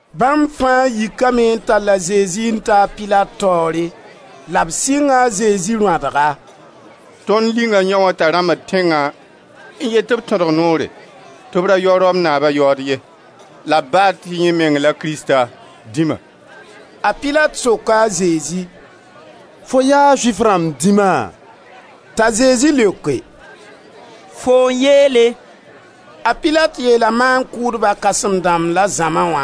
Bãmb fãa yikame n tall a Zezi n taa a Pilat taoore. La b sɩnga a Zezi rõadga: «Tõnd linga yãoo t'a rãmbd tẽngã n yet tɩ b tõdg noore, tɩ b ra yao Rom naaba yaood ye, la b baad tɩ yẽ meng la Krista-Dĩma.» A Pilat soka a Zezi: «Fo yaa Zʋɩf rãmb dĩma?» T'a Zezi leoke: «Foo n yeele.» A Pilat yeela maan-kʋʋdba kãsem-dãmb la zãma wã: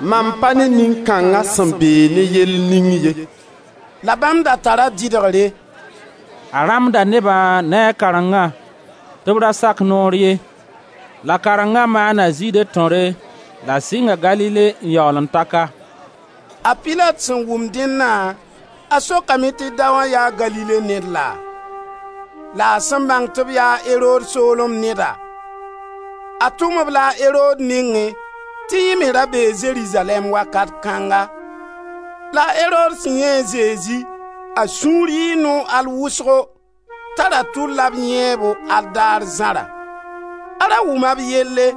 «Mam pa ne nin kãnga sẽn beeg ne yell ning ye.» La bãmb da tara dɩdgre: «A rãmbda neba ne a karengã, tɩ b ra sak noor ye; la karengã maana Zɩɩde tõre, la sɩnga Galile n yaool n ta ka.» A Pilat sẽn wʋm dẽnna, a sokame tɩ daoã yaa Galile ned laa? La a sẽn bãng tɩ b yaa Erod soolem neda, a tʋm-b-la a Erod nengẽ tɩ yẽ me ra bee Zerizalɛɛm wakat kãnga. La a Erod sẽn yãe a Zezi, a sũur yɩɩ noog al wʋsgo, t'a ra tʋlla b yãeebo al daar zãra; a ra wʋma b yelle,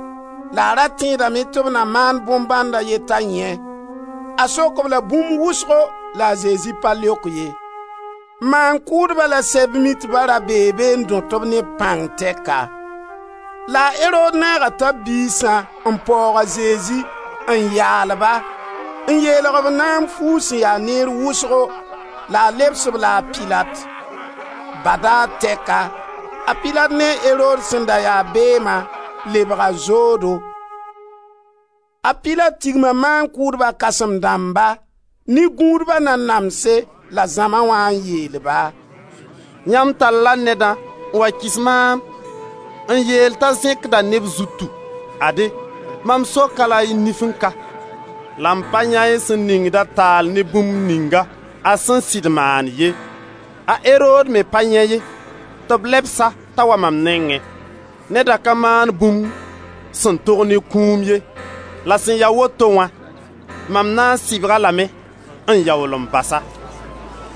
la a ra tẽedame tɩ b na maan bõn-bãnd a ye t'a yãe. A sok-b-la bũmb wʋsgo la a Zezi pa leok ye. Maan-kʋʋdba la Seb-mitba ra bee be n dõt-b ne b pãng tɛka. La a Erod naaga tãb-biisã n paoog a Zezi, n yaal-ba, n yeelg-b naam fuug sẽn ya neer wʋsgo la a lebs-b-la a Pilat. Badaar tɛka, a Pilat ne a Erod sẽn da ya beema, lebga zoodo. A Pilat tigma maan-kʋʋdba kãsem-dãmba, ne gũudba nanamse la zãma wã n yeel-ba: «Yãmb talla nedã n wa kɩs maam n yeel t'a zẽkda neb zutu. Ade, mam sok-a la y nifẽ ka, la m pa yãe y sẽn ningda taal ne bũmb ningã, a sẽn sɩd maan ye. A Erod me pa yãe ye, tɩ b lebs-a t'a wa mam nengẽ. Nedã ka maan bũmb sẽn tog ne kũum ye. La sẽn ya woto wã, maan na n sɩbg-a lame n yaool n bas-a.» [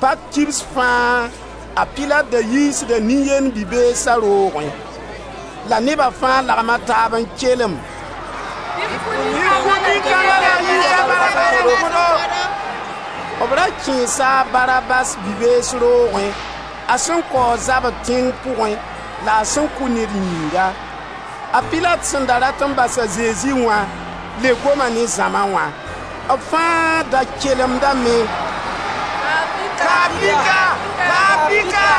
Pak kibs fãa a Pilat da yiisda nin-yend bi-beesa roogẽ.] La neba fãa lagma taab n kelem: «Bɩ f kʋ nin-kãnga la f yiis a Barabas n kõ-do.» B ra kẽesa a Barabas bi-bees roogẽ a sẽn kaoog zabr tẽng pʋgẽ la a sẽn kʋ ned yĩnga. A Pilat sẽn da rat n bas a Zezi wã le goma ne zãma wã. B fãa da kelemdame: «Ka-a pika! Ka-a pika!»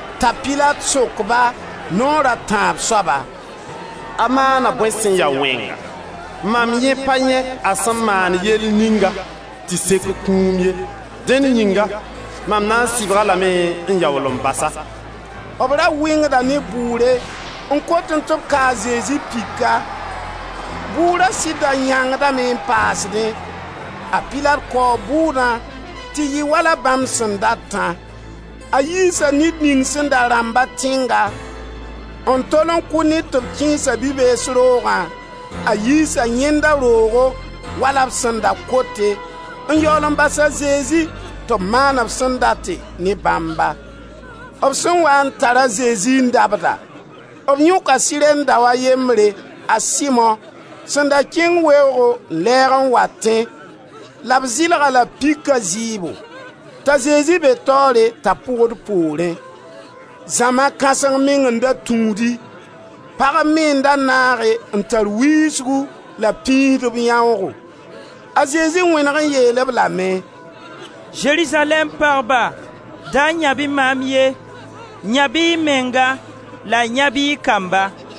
T'a Pilat sok-ba, naoor a tãab soaba: «A maana bõe sẽn ya wẽnga? Mam yẽ pa yãe a sẽn maan yell ninga tɩ sek kũum ye. Dẽn yĩnga mam na n sɩbg-a lame n yaool n bas-a.» B ra wɩngda ne bʋʋre n kotẽ tɩ b ka a Zezi pika. Bʋʋra sɩd da yãngdame n paasdẽ. A Pilat kaoo bʋʋdã tɩ yɩ wala bãmb sẽn datã. A yiisa ned ning sẽn da rãmba tẽnga, n tol n kʋ ned tɩ b kẽes-a bi-bees roogã, a yiisa yẽndã roogo wala b sẽn da kote, n yaool n bas a Zezi tɩ b maan b sẽn date ne bãmba. B sẽn waa n tar a Zezi n dabda, b yõka Sirɛn daoa a yembre, a Simo, sẽn da kẽng weoogo n lɛɛg n watẽ la b zɩlg-a-la pika zɩɩbo, t'a Zezi be taoore t'a pʋgd poorẽ. Zãma kãseng meng n da tũudi. Pagb me n da naage n tar wiisgu la b pĩisd b yãoogo. A Zezi wẽneg n yeel-b lame: «Zerizalɛɛm pagba, da yãb-y maam ye, yãb-y y menga la yãb-y y kamba!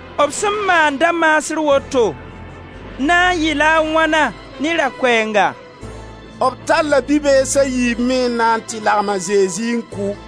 B sẽn maan da-maasr woto, na n yɩla a wãna ne ra-koeenga?» B talla bi-bees a yiib me n na tɩ lagem a Zezi n kʋ.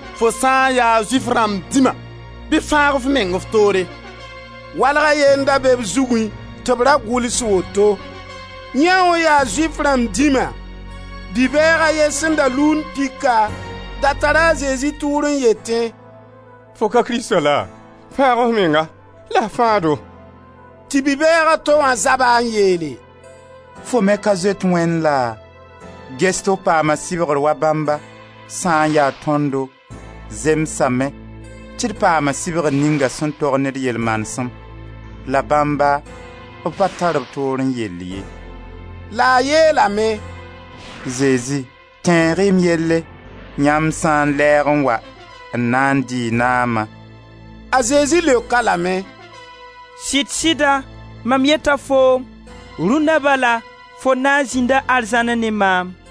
«Fo sã n ya Zʋɩf rãmb dĩma bɩ f fãag f meng f toore!» Walg a ye n da be b zugẽ tɩ b ra gʋls woto: «Yãoo yaa Zʋɩf rãmb dĩma.» Bi-bɛɛg a ye sẽn da luund pika, da tara a Zezi tʋʋr n yetẽ: «Fo ka Krista laa? Fãag f menga, la f fãag-do!» Tɩ bi-bɛɛg a to wã zab-a n yeele: «Fo me ka zoet Wẽnd laa? Ges tɩ f paama sɩbgr wa bãmba. Sã n ya tõndo, zemsame, tɩ d paama sɩbgr ninga sẽn tog ne d yel-manesem; la bãmba, b pa tar b toorẽ yell ye.» La a yeelame: «Zezi, tẽeg-y m yelle, yãmb sã n lɛɛg n wa n na n dɩ y naama.» A Zezi leok-a lame: «Sɩd-sɩda, mam yeta foom, rũnda bala, fo na n zĩnda arzãnẽ ne maam.»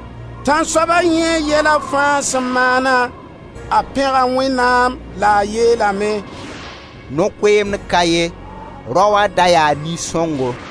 Tãnsoaba yãe yɛla fãa sẽn maana, a pẽga Wẽnnaam la a yeelame: «No-koeemd ka ye, raoã da yaa nin-sõngo!»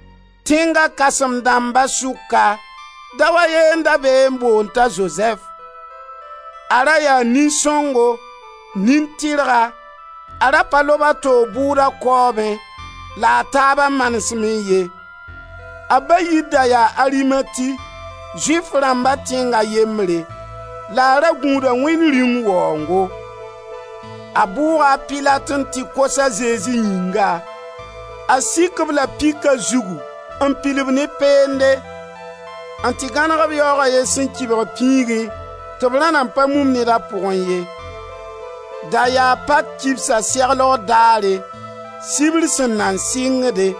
Tẽng kãsem-dãmba sʋka, dao a ye n da be n boond t'a Zozɛf. A ra yaa nin-sõngo, nin-tɩrga, a ra pa lob a toog bʋʋda kaoobẽ, la a taaba manesmẽ ye; a ba yir da yaa Arimati, Zʋɩf rãmba tẽng a yembre, la a ra gũuda Wẽnd Rĩung waoongo. A bʋʋga a Pilat n tɩ kos a Zezi yĩnga. A sik-b la pika zugu n pil-b ne peende, n tɩ gãneg-b yaoog a ye sẽn kɩbg pĩigẽ tɩ b ra nan pa mum ned a pʋgẽ ye. Da yaa pak kibsa seglgo daare, sibr sẽn nan sɩngde.